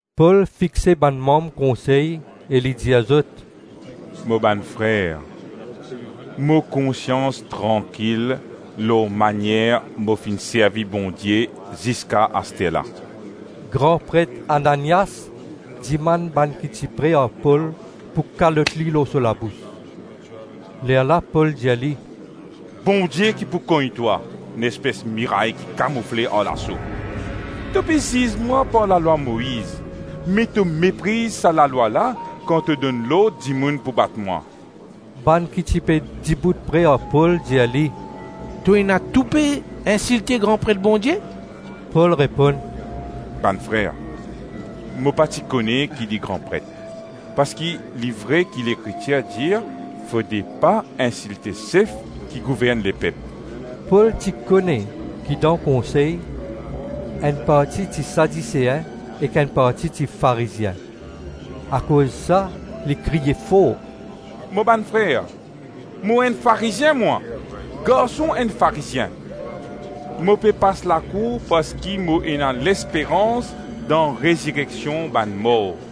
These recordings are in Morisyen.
Pol fixe bann manm konsey e li dir zot, “Mo bann frer, mo konsians trankil lor manier mo finn servi Bondie ziska asterla.” Gran pret Ananias dimann bann ki ti pre ar Pol pou kalot li lor so labous. Lerla Pol dir li, “Bondie ki pou kogn twa, nespes miray ki kamoufle ar laso. To pe ziz mwa par lalwa Moiz, me to mepriz sa lalwa la kan to donn lord dimoun pou bat mwa.” Bann ki ti pe dibout pre ar Pol dir li, “To ena toupe insilte gran pret Bondie?” Pol reponn, “Bann frer, mo pa ti kone ki li gran pret, parski li vre ki Lekritir dir fode pa insilte sef ki gouvern lepep.” Pol ti kone ki dan konsey enn parti ti Sadisein ek enn parti ti Farizien. Akoz sa li kriye for, “Mo bann frer, mo enn Farizien mwa, garson enn Farizien. Mo pe pas lakour parski mo ena lesperans dan rezireksion bann mor.”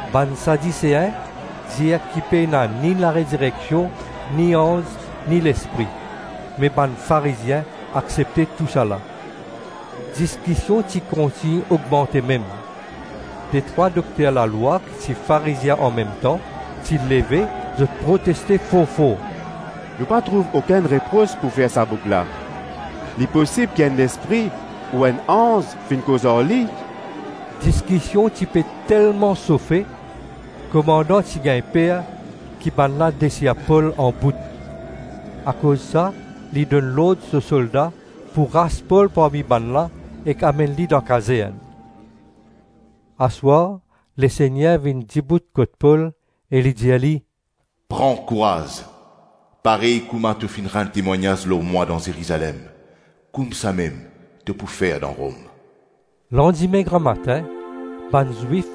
(Bann Sadisein dir ki pena ni larezireksion, ni anz, ni lespri; me bann Farizien aksepte tousala.) Diskision ti kontign ogmante mem. Detrwa dokter lalwa ki ti Farizien anmemtan ti leve, zot proteste for-for, “Nou pa trouv okenn repros pou fer sa boug la. Li posib ki enn lespri ou enn anz finn koz ar li.” Diskision ti pe telman sofe, komandan ti gagn per ki bannla desir Pol anbout. Akoz sa li donn lord so solda pou ras Pol parmi bannla ek amenn li dan kazern. Aswar Lesegner vinn dibout kot Pol e li dir li, “Pran kouraz! Parey kouma to finn rann temwagnaz lor mwa dan Zerizalem, koumsamem to pou fer dan Rom.” Landime gramatin bann Zwif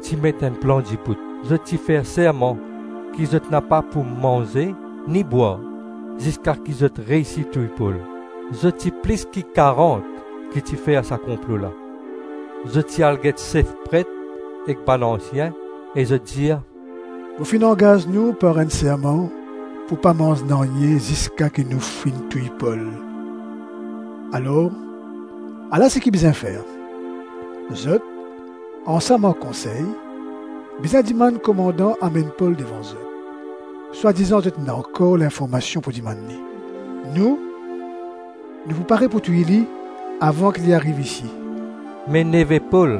ti met enn plan dibout. Zot ti fer serman ki zot napa pou manze ni bwar ziska ki zot reysi touy Pol. Zot ti plis ki karant ki ti fer sa konplo la. Zot ti al get sef pret ek bann ansien e zot dir, “Nou finn angaz nou par enn serman pou pa manz nanye ziska ki nou finn touy Pol. Alors, ala seki bizin fer: zot, ansam ar konsey, bizin dimann komandan amenn Pol devan zot, swadizan zot ena ankor linformasion pou dimann li. Nou, nou pou pare pou touy li avan ki li ariv isi.” Me neve Pol,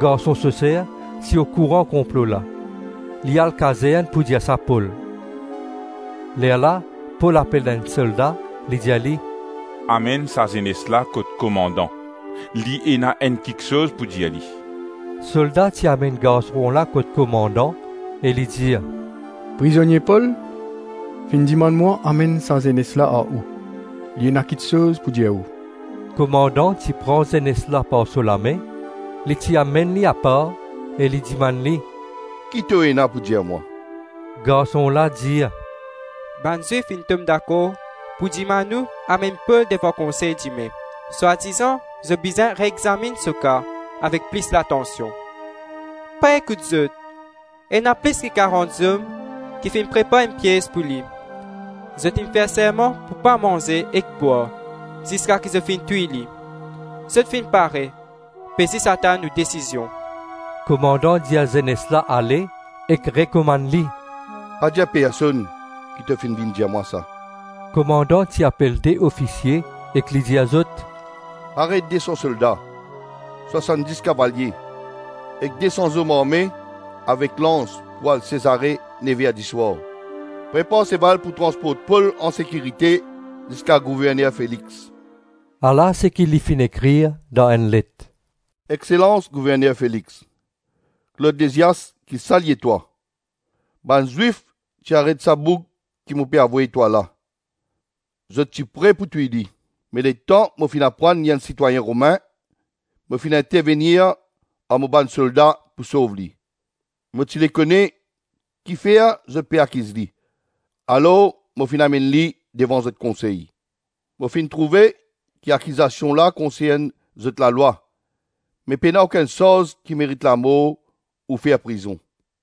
garson so ser, ti okouran konplo la; li al kazern pou dir sa Pol. Lerla Pol apel enn solda, li dir li, “Amenn sa zenes la kot komandan, li ena enn kiksoz pou dir li.” Solda ti amenn garson la kot komandan e li dir, “Prizonie Pol, finn dimann mwa amenn sa zenes la ar ou, li ena kiksoz pou dir ou.” Komandan ti pran zenes la par so lame, li ti amenn li apar, e li dimann li, “Ki to ena pou dir mwa?” Garson la dir, “Bann Zwif finn tom dakor pou dimann ou amenn Pol devan konsey dime, swadizan zot bizin reexaminn so ka avek plis latansion. Pa ekout zot. Ena plis ki karant zom ki finn prepar enn piez pou li. Zot inn fer serman pou pa manze ek bwar ziska ki zot finn touy li. Zot finn pare, pe zis atann ou desizion.” Komandan dir zenes la ale ek rekomann li, “Pa dir personn ki to finn vinn dir mwa sa.” Komandan ti apel de ofisie ek li dir zot, “Pare de-san solda, swasann-dis kavalie, ek de-san zom arme avek lans pou al Sezare nev-er diswar. Prepar seval pou transport Pol ansekirite ziska gouverner Felix.” Ala seki li finn ekrir dan enn let: “Exselans Gouverner Felix, Klod Lizias ki salye twa. Bann Zwif ti aret sa boug ki mo pe avoy twa la. Zot ti pre pou touy li. Me letan mo finn aprann li enn sitwayin Romin, mo finn intervenir ar mo bann solda pou sov li. Mo ti le kone kifer zot pe akiz li, alors mo finn amenn li devan zot konsey. Mo finn trouve ki akizasion la konsern zot lalwa, me pena okenn sarz ki merit lamor ou fer prizon.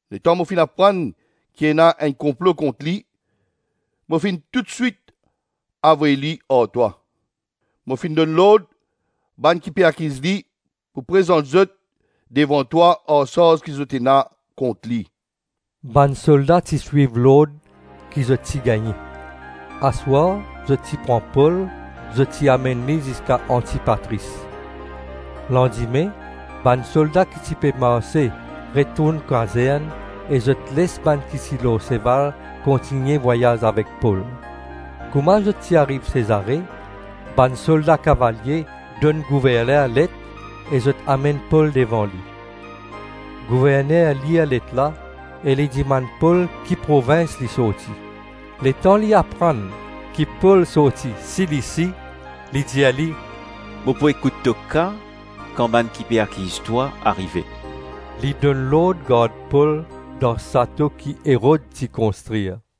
Letan mo finn aprann ki ena enn konplo kont li, mo finn toutswit avoy li ar twa. Mo finn donn lord bann ki pe akiz li pou prezant zot devan twa ar sarz ki zot ena kont li.” Bann solda ti swiv lord ki zot ti gagne. Aswar zot ti pran Pol zot ti amenn li ziska Antipatris. Landime bann solda ki ti pe marse retourn kazern e zot les bann ki ti lor seval kontigne vwayaz avek Pol. Kouma zot ti ariv Sezare, bann solda-kavalie donn gouverner let e zot amenn Pol devan li. Gouverner lir let la e li dimann Pol ki provins li sorti. Letan li aprann ki Pol sorti Silisi, li dir li, “Mo pou ekout to ka kan bann ki pe akiz twa arive.” Li donn lord gard Pol dan sato ki Erod ti konstrir.